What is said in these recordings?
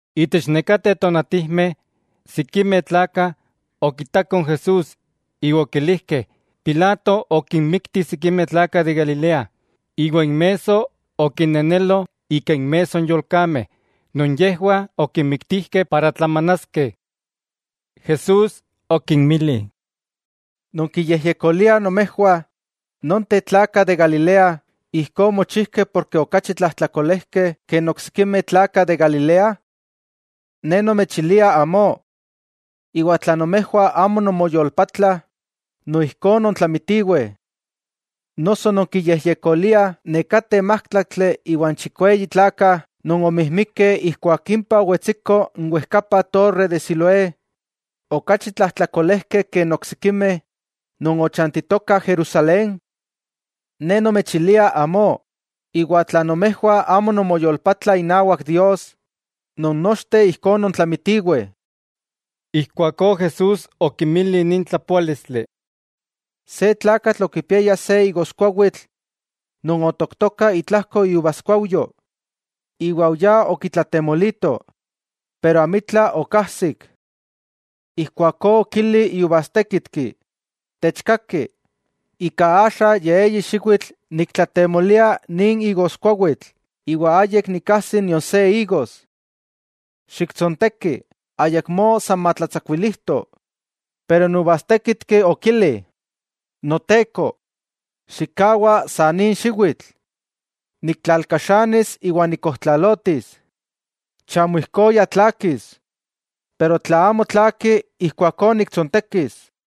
Itech nekateh tonatijmeh, sikimeh tlakah okitakoh n Jesús iwa okilijkeh Pilato okinmikti sikimeh tlakah de Galilea, iwa inmesso okinenelo ika inmesso n yolkameh non yejwah okinmiktijkeh para tlamanaskeh. Jesús okinmili: —¿Nonkiyejyekoliah nomejwah nonteh tlakah de Galilea ijkó omochijkeh porke okachi tlajtlakolejkeh ke n oksikimeh tlakah de Galilea? Ne nomechilia amó; iwa tla nomejwah amo nonmoyolpatlah, noijkó nontlamitiweh. ¿Noso nonkiyejyekoliah nekateh májtlaktli iwa n chikweyi tlakah non omijmikeh ijkuak impah owetsiko n wejkapa torre de Siloé, okachi tlajtlakolejkeh ke n oksikimeh non ochantitokah Jerusalén? Ne nomechilia amó, iwa tla nomejwah amo nonmoyolpatlah inawak Dios, non nochteh ijkó nontlamitiweh. Ijkuakó Jesús okinmili nin tlapoálistli: —Se tlakatl okipiaya se igoskuawitl non otooktoka itlajko iuvaskuauyo, iwa oyá okitlatemolito, pero amitla okajsik. Ijkuakó okili iuvastékitki: “Techkaki, ika axa ya eyi xiwitl nikwaltlatemolia nin igoskuawitl iwa ayik nikajsi nion se igos. Xiktsonteki, ayakmó san matlatsakuilijto.” Pero n uvastékitki okili: “Noteko, xikkawa sa nin xiwitl; niktlalkaxanis iwa nikkojtlalotis. Chamo ijkó ya tlaakis. Pero tla amo tlaaki, ijkuakó niktsontekis.”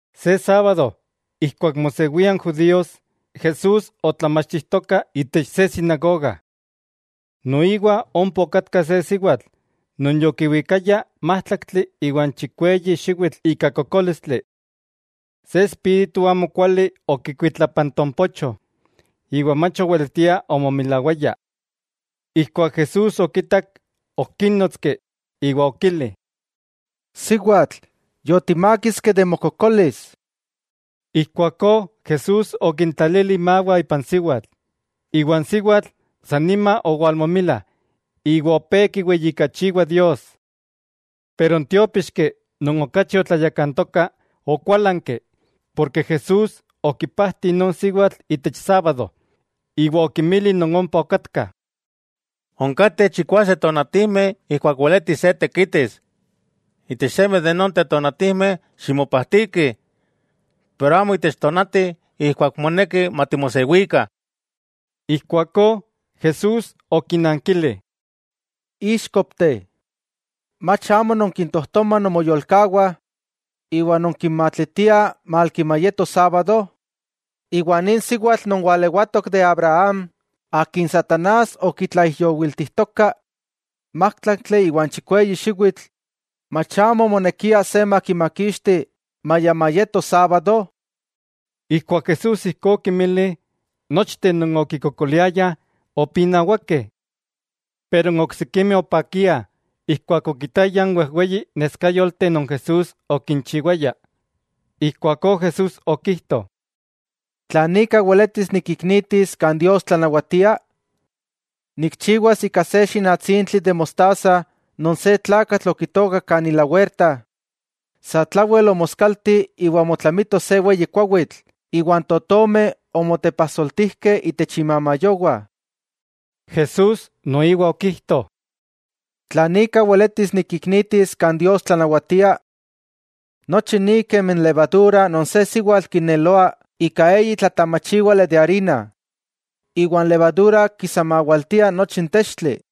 Se sábado ijkuak mosewia n judíos, Jesús otlamachtijtoka itech se sinagoga. Noiwa ompa okatka se siwatl non yokiwikaya májtlaktli iwa n chikweyi xiwitl ika kokólistli. Se espíritu amokuali okikuitlapantompocho iwa mach oweletia omomilawaya. Ijkuak Jesús okitak okínotski iwa okili: —Siwatl, yotimákiski de mokokolis. Ijkuakó Jesús okintlali imawah ipan siwatl, iwa n siwatl san nima owalmomila iwa opé kiweyijkachiwa Dios. Pero n tiópixki non okachi otlayakantoka okuálanki, porke Jesús okipajti non siwatl itech sábado, iwa okinmili non ompa okatkah: —Onkateh chikwase tonatijmeh ijkuak weletis se tekitis; itech seme de nonteh tonatijmeh ximopajtikih, pero amo itech tonati ijkuak moneki matimosewikah. Ijkuakó Jesús okinankili: —¡Íxkopteh!, ¿mach amo nonkintojtomah nomoyolkawah iwa nonkinmatlitiah malki mayeto sábado? Nin siwatl non walewatok de Abraham, akin satanás okitlaijyowiltijtoka májtlaktli iwa n chikweyi xiwitl, ¿mach amo omonekia se makimakixti maya mayeto sábado? Ijkuak Jesús ijkó okinmili, nochteh non okikokoliayah opinawakeh. Pero n oksikimeh opakiah ijkuak okitayah n wejweyi neskayolteh non Jesús okinchiwaya. Ijkuakó Jesús okijto: —¿Tlan ika weletis nikiknitis kan Dios tlanawatia? Nikchiwas ika se xinatsintli de mostaza non se tlakatl okitookak kan ilawerta, satlawel omoskalti iwa omotlamito se weyi kuawitl iwa n totomeh omotepajsoltijkeh itech imamayowah. Jesús noiwa okijto: —¿Tlan ika weletis nikiknitis kan Dios tlanawatia? Nochi ni kemi n levadura non se siwatl kineloa ika eyi tlatamachiwali arina. Iwa n levadura kisamawaltia nochi n textli.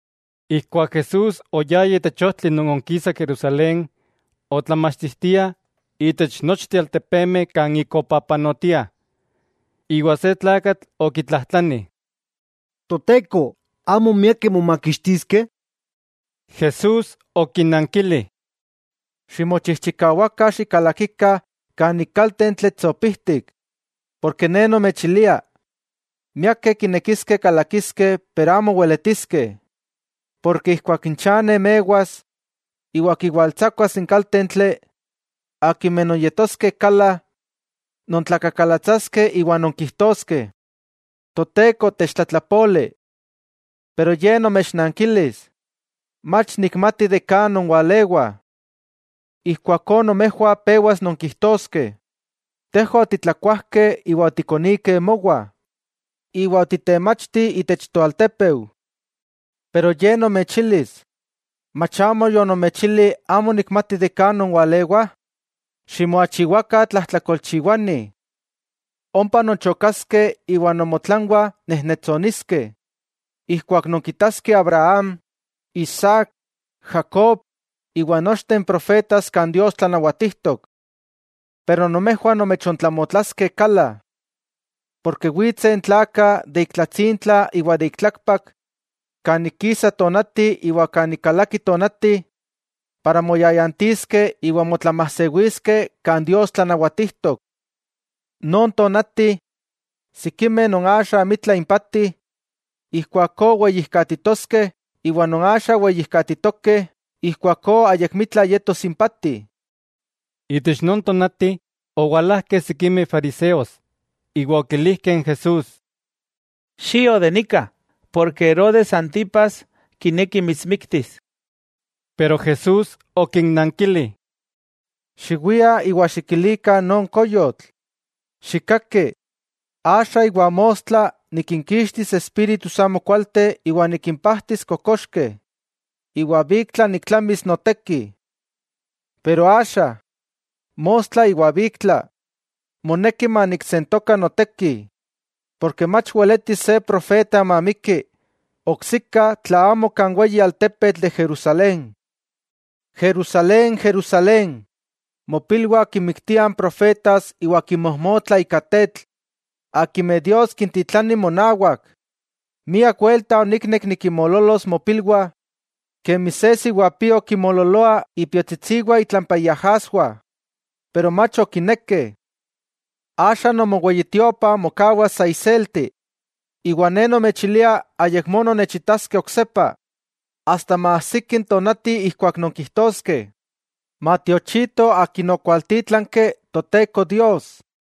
Ijkuak Jesús oyaya itech ojtli non onkisa Jerusalén, otlamachtijtiah itech nochteh altepemeh kan ik opapanotia. Iwa se tlakatl okitlajtlani: —Toteko, ¿amo miakeh momakixtiskeh? Jesús okinankili: —Ximochijchikawakah xikalakikah kan ik kaltentli tsopijtik, Ne nomechilia, miakeh kinekiskeh kalakiskeh pero amo weletiskeh. Porke ijkuak n chane mewas iwa kiwaltsakuas n kaltentli, akimeh nonyetoskeh kala, nontlakakalatsaskeh iwa nonkijtoskeh: “Toteko, techtlatlapoli.” Pero Ye nomechnankilis: “Mach nikmati kan nonwalewah.” Ijkuakó nomejwah pewas nonkijtoskeh: “Tejwah otitlakuajkeh iwa otikonikeh mowah, iwa otitemachti itech toaltepeu.” Pero Ye nomechilis: “Mach amo yonomechili amo nikmati kan nonwalewah. Ximoachiwakah tlajtlakolchiwanih.” Ompa nonchokaskeh iwa nomotlanwah nejnetsontoskeh ijkuak nonkitaskeh Abraham, Isaac, Jacob iwa nochteh n profetas kan Dios tlanawatijtok. Pero nomejwah nomechontlamotlaskeh kala. Porke witseh n tlakah de ik tlatsintla iwa de ik tlakpak, kan ik kisa tonati iwa kan ik kalaki tonati, moyayantiskeh iwa motlamajsewiskeh kan Dios tlanawatijtok. Non tonati, sikimeh non axa amitla impati, ijkuakó weyijkatitoskeh, iwa non axa weyijkatitokeh ijkuakó ayakmitla yetos impati. Itech non tonati owalajkeh sikimeh fariseos iwa okilijkeh n Jesús: —Xio de nika, porke Herodes Antipas kineki mitsmiktis. Pero Jesús okinnankili: —Xiwiah iwa xikilikah non koyotl: “Xikkaki, axa iwa mostla nikinkixtis espíritus amokualteh iwa nikimpajtis kokoxkeh, iwa biktla niktlamis noteki.” Pero axa, mostla iwa biktla, moneki maniksentoka noteki, porke mach weletis se profeta mamiki oksika tla amo kan weyi altepetl de Jerusalén. '¡Jerusalén, Jerusalén, mopilwah kinmiktiah n profetas iwa kinmojmotlah ika tetl akimeh Dios kintitlani monawak! ¡Miak welta oniknek nikinmoololos mopilwah, kemi se siwapio kimoololoa ipiotsitsiwah itlampa iajaswah, pero mach okinekeh! Axa nomoweyitiopa mokawas sa iselti, iwa Ne nomechilia ayakmó nonnechitaskeh oksepa asta maajsiki n tonati ijkuak nonkijtoskeh: “Matiochito Akin okwaltítlanki Toteko Dios.”